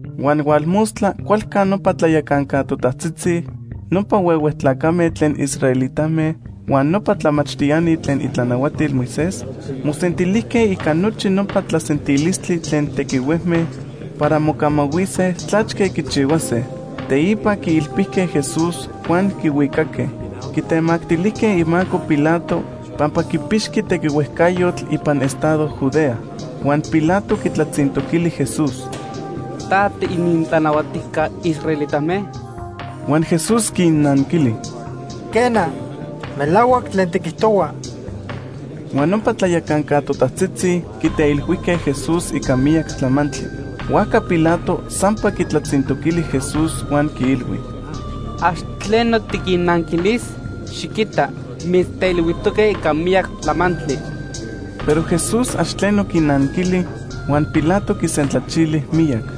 Huan hualmostla cualca nopa tlayacanca totajtzitzi, nopa huehue tlacame tlen israelitame huan nopa tlamachtiani tlen itlanahuatil Moisés, mosentilijque ica nochi nopa tlasentilistli tlen tequihuejme para mocamahuise tlachque quichihuase. Teipa quiilpijque Jesús huan quihuicaque. Quitemactilijque imaco Pilato pampa quipixqui tequihuejcayotl ipan estado Judea. Huan Pilato quitlatzintoquili Jesús: ―¿Ta tiinintlanahuatijca israelitame? Huan Jesús quinanquili: ―Quena. Melahuac tlen tiquijtohua. Huan nopa tlayacanca totajtzitzi quiteilhuijque Jesús ica miyac tlamantli. Huajca Pilato sampa quitlatzintoquili Jesús huan quiilhui: ―¿Ax tleno tiquinnanquilis? Xiquita, mitzteilhuijtoque ica miyac tlamantli. Pero Jesús ax tleno quinanquili, huan Pilato quisentlachili miyac.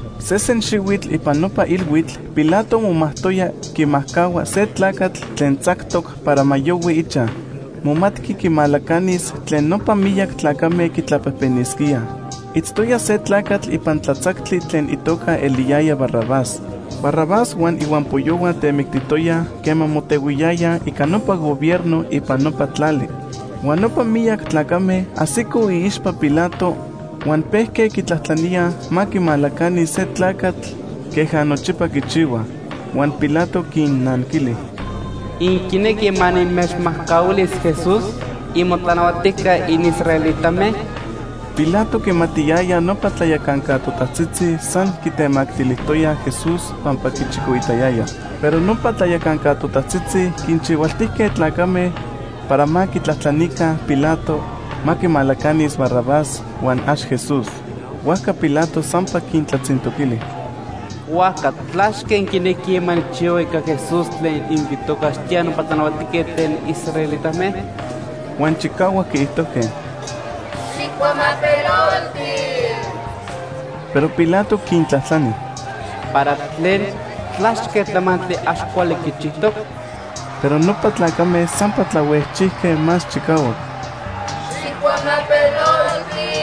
Sesen xihuitl ipan nopa ilhuitl Pilato momajtoya quimajcahua se tlacatl tlen tzactoc para ma yohui ichaj. Momatqui quimalacanis tlen nopa miyac tlacame quitlajpejpenisquíaj. Itztoya se tlacatl ipan tlatzactli tlen itoca eliyaya Barrabás. Barrabás huan ihuampoyohua temictijtoyaj quema motehuiyayaj ica nopa gobierno ipan nopa tlali. Huan nopa miyac tlacame ajsicoj iixpa Pilato huan pejque quitlajtlaníaj ma quimalacanis se tlacatl queja nochipa quichihuaj. Huan Pilato quinnanquili: ―¿Inquinequij ma nimechmajcahuilis Jesús, imotlanahuatijca inisraelitame? Pilato quimatiyaya nopa tlayacanca totajtzitzi san quitemactilijtoyaj Jesús pampa quichicoitayayaj. Pero nopa tlayacanca totajtzitzi quinchihualtijque tlacame para ma quitlajtlanica Pilato ma quimalacanis Barrabás, huan ax Jesús. Huajca Pilato sampa quintlatzintoquili: ―¿Huajca tlachque inquinequij ma nijchihua ica Jesús tlen inquitocaxtíaj nopa tlanahuatijquetl tlen israelitame? Huan chicahuac quiijtojque: ―¡Xijcuamapelolti! Pero Pilato quintlajtlani: ―¿Para tlen? ¿Tlachque tlamantli ax cuali quichijtoc? Pero nopa tlacame sampa tlahuejchijque más chicahuac: ―¡Xijcuamapelolti!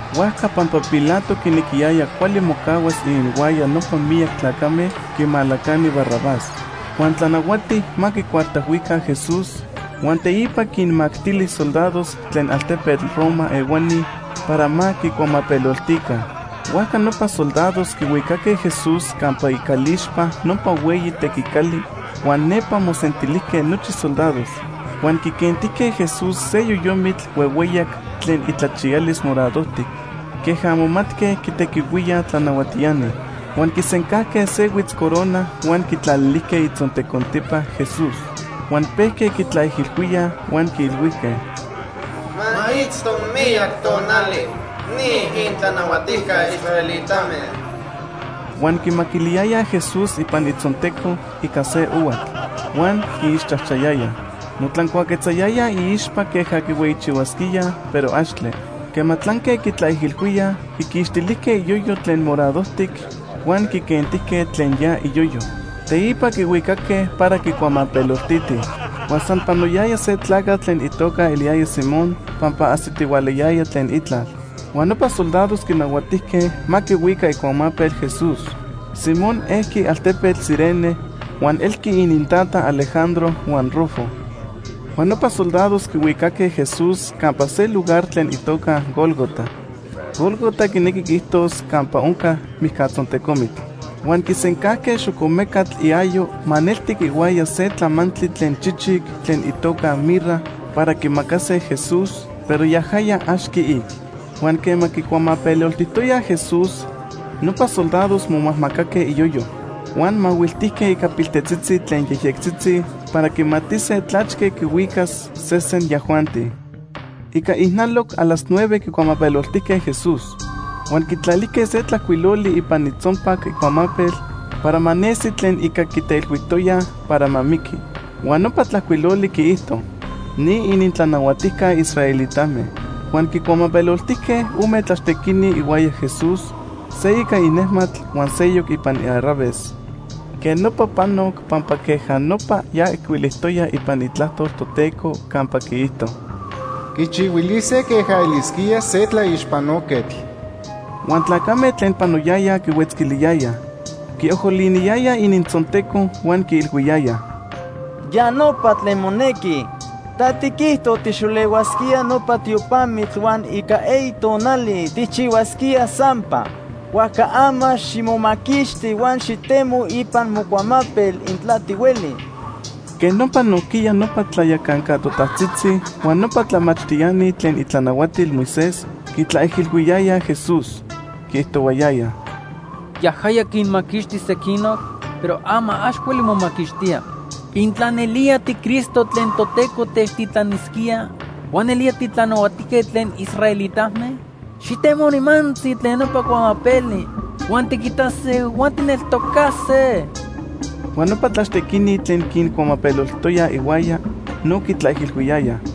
Huajca pampa Pilato quinequiyaya cuali mocahuas ininhuaya nopa miyac tlacame, quimalacani Barrabás. Huan tlanahuati ma quicuartajhuica Jesús, huan teipa quinmactili soldados tlen altepetl Roma ehuani para ma quicuamapeloltica. Huajca nopa soldados quihuicaque Jesús campa icalixpa nopa hueyi tequicali, huan nepa mosentilijque nochi soldados. Huan quiquentijque Jesús se yoyomitl huehueyac tlen itlachiyalis moradojtic queja momatque quitequihuíaj tlanahuatiani. Huan quisencajque se huitzcorona huan quitlalilijque itzontecontipa Jesús. Huan pejque quitlaijilhuíaj huan quiilhuijque: ―¡Ma itzto miyac tonali ni inintlanahuatijca israelitame! Huan quimaquiliyayaj Jesús ipan itzonteco ica se ohuatl, huan quiixchajchayayaj. Motlancuaquetzayayaj iixpa queja quihueyichihuasquíaj, pero axtle. Quema tlanque quitlaijilhuíaj, quiquixtilijque iyoyo tlen moradojtic huan quiquentijque tlen ya iyoyo. Teipa quihuicaque para quicuamapeloltitij. Huan san panoyaya se tlacatl tlen itoca eliyaya Simón pampa ajsitihualayaya tlen itlal. Huan nopa soldados quinahuatijque ma quihuica icuamapel Jesús. Simón ejqui altepetl Cirene huan elqui inintata Alejandro huan Rufo. Huan nopa soldados quihuicaque Jesús campa se lugar tlen itoca Gólgota. (Gólgota quinequi quiijtos Campa Onca Mijcatzontecomitl.) Huan quisencajque xocomecatl iayo maneltic ihuaya se tlamantli tlen chichic tlen itoca mirra para quimacase Jesús, pero yajaya ax quiic. Huan quema quicuamapeloltijtoyaj Jesús, nopa soldados momajmacaque iyoyo. Huan mahuiltijque ica piltetzitzi tlen yejyectzitzi para quimatise tlachque quihuicas sesen yajuanti. Ica ijnaloc a las nueve quicuamapeloltijque Jesús. Huan quitlalijque se tlajcuiloli ipan itzonpac icuamapel para ma nesi tlen ica quiteilhuijtoyaj para ma miqui. Huan nopa tlajcuiloli quiijto: NI ININTLANAHUATIJCA ISRAELITAME. Huan quincuamapeloltijque ome tlaxtequini ihuaya Jesús, se ica inejmatl, huan seyoc ipan iarraves. Quej nopa panoc pampa queja nopa ya ijcuilijtoya ipan Itlajtol Toteco campa quiijto: “Quichihuilise queja elisquía se tlaixpanoquetl.” Huan tlacame tlen panoyayaj quihuetzquiliyayaj. Quiojoliniyayaj inintzonteco huan quiilhuiyayaj: ―¡Ya nopa tlen monequi! Ta tiquijto tijxolehuasquía nopa tiopamitl huan ica eyi tonali tijchihuasquía sampa. Huajca ama ximomaquixti huan xitemo ipan mocuamapel, intla tihueli. Quej nopa nojquiya nopa tlayacanca totajtzitzi huan nopa tlamachtiani tlen itlanahuatil Moisés quitlaijilhuiyayaj Jesús. Quiijtohuayayaj: ―Yajaya quinmaquixti sequinoc, pero ama ax hueli momaquixtía. Intla nelía tiCristo tlen Toteco techtitlanisquía huan nelía titlanahuatijquetl tlen israelitame, xitemo nimantzi tlen nopa cuamapeli, huan tiquitase huan tijneltocase. Huan nopa tlaxtequini tlen quincuamapeloltijtoyaj ihuaya, no quitlaijilhuiyayaj.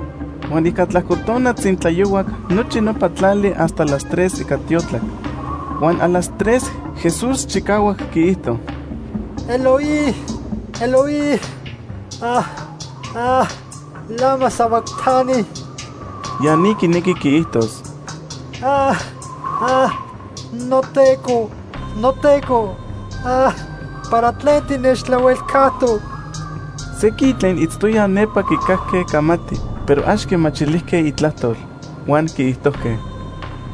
Huan ica tlajco tona tzintlayohuac nochi nopa tlali hasta las tres ica tiotlac. Huan a las tres Jesús chicahuac quiijto: “Eloi, Eloi, ¿lama sabactani?” (Ya ni quinequi quiijtos: “NoTeco, noTeco, ¿para tlen tinechtlahuelcajtoc?”) Sequin tlen itztoyaj nepa quicajque camati, pero ax quimachilijque itlajtol. Huan quiijtojque: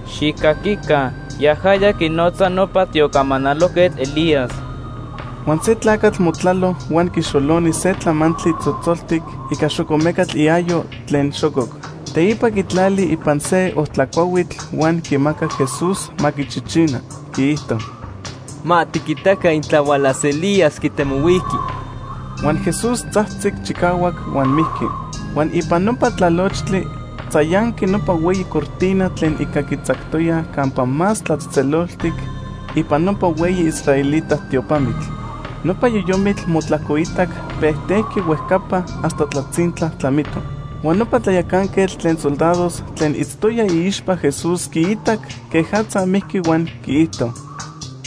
―¡Xijcaquica! Yajaya quinotza nopa tiocamanalojquetl Elías. Huan se tlacatl motlalo huan quixoloni se tlamantli tzotzoltic ica xocomecatl iayo tlen xococ. Teipa quitlali ipan se ojtla cuahuitl huan quimacac Jesús ma quichichina. Quiijto: ―Ma tiquitaca intla hualas Elías quitemohuiqui. Huan Jesús tzajtzic chicahuac huan mijqui. Huan ipan nopa tlalochtli tzayanqui nopa hueyi cortina tlen ica quitzactoyaj Campa Más Tlatzejtzeloltic ipan nopa hueyi israelita tiopamitl. Nopa yoyomitl motlajcoitac pejtejqui huejcapa hasta tlazintla tlamito. Huan nopa tlayacanquetl tlen soldados tlen itztoya iixpa Jesús quiitac quejatza mijqui huan quiijto: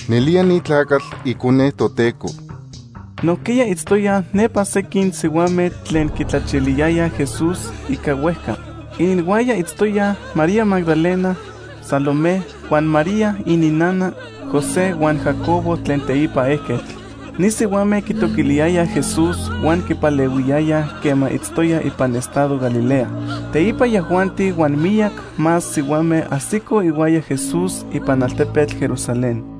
―Nelía ni tlacatl Icone Toteco. Nojquiya itztoyaj nepa sequin sihuame tlen quitlachiliyayaj Jesús ica huejca. Ininhuaya itztoyaj María Magdalena, Salomé huan María ininnana José huan Jacobo tlen teipa ejquetl. Ni sihuame quitoquiliyayaj Jesús huan quipalehuiyayaj quema itztoya ipan estado Galilea. Teipa yajuanti huan miyac más sihuame ajsicoj ihuaya Jesús ipan altepetl Jerusalén.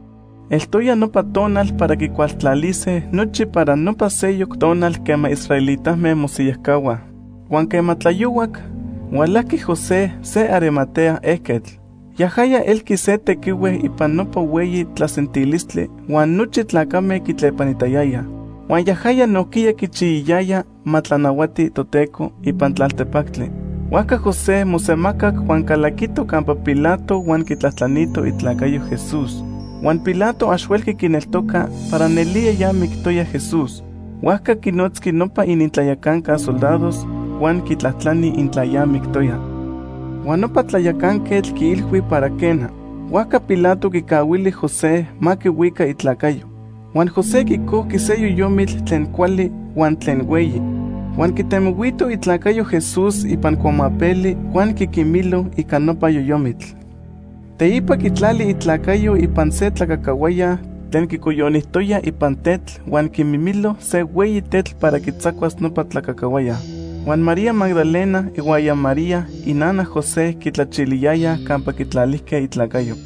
Eltoya nopa tonal para quicualtlalise nochi para nopa seyoc tonal quema israelitame mosiyajcahuaj. Huan quema tlayohuac, hualajqui José se Arimatea ejquetl. Yajaya elqui se tequihue ipan nopa hueyi tlasentilistli huan nochi tlacame quitlepanitayayaj. Huan yajaya nojquiya quichiyayaya ma tlanahuati Toteco ipan tlaltepactli. Huajca José mosemacac huan calaquito campa Pilato huan quitlajtlanito itlacayo Jesús. Huan Pilato ax huelqui quineltoca para nelía ya mictoya Jesús. Huajca quinotzqui nopa inintlayacanca soldados huan quitlajtlani intla ya mictoya. Huan nopa tlayacanquetl quiilhui para quena. Huajca Pilato quicahuili José ma quihuica itlacayo. Huan José quicojqui se yoyomitl tlen cuali huan tlen hueyi, huan quitemohuito itlacayo Jesús ipan cuamapeli huan quiquimilo ica nopa yoyomitl. Teipa quitlali itlacayo ipan se tlacacahuaya tlen quicoyonijtoya ipan tetl huan quimimilo se hueyi tetl para quitzacuas nopa tlacacahuaya. Huan María Magdalena ihuaya María inana José quitlachiliyayaj campa quitlalijque itlacayo.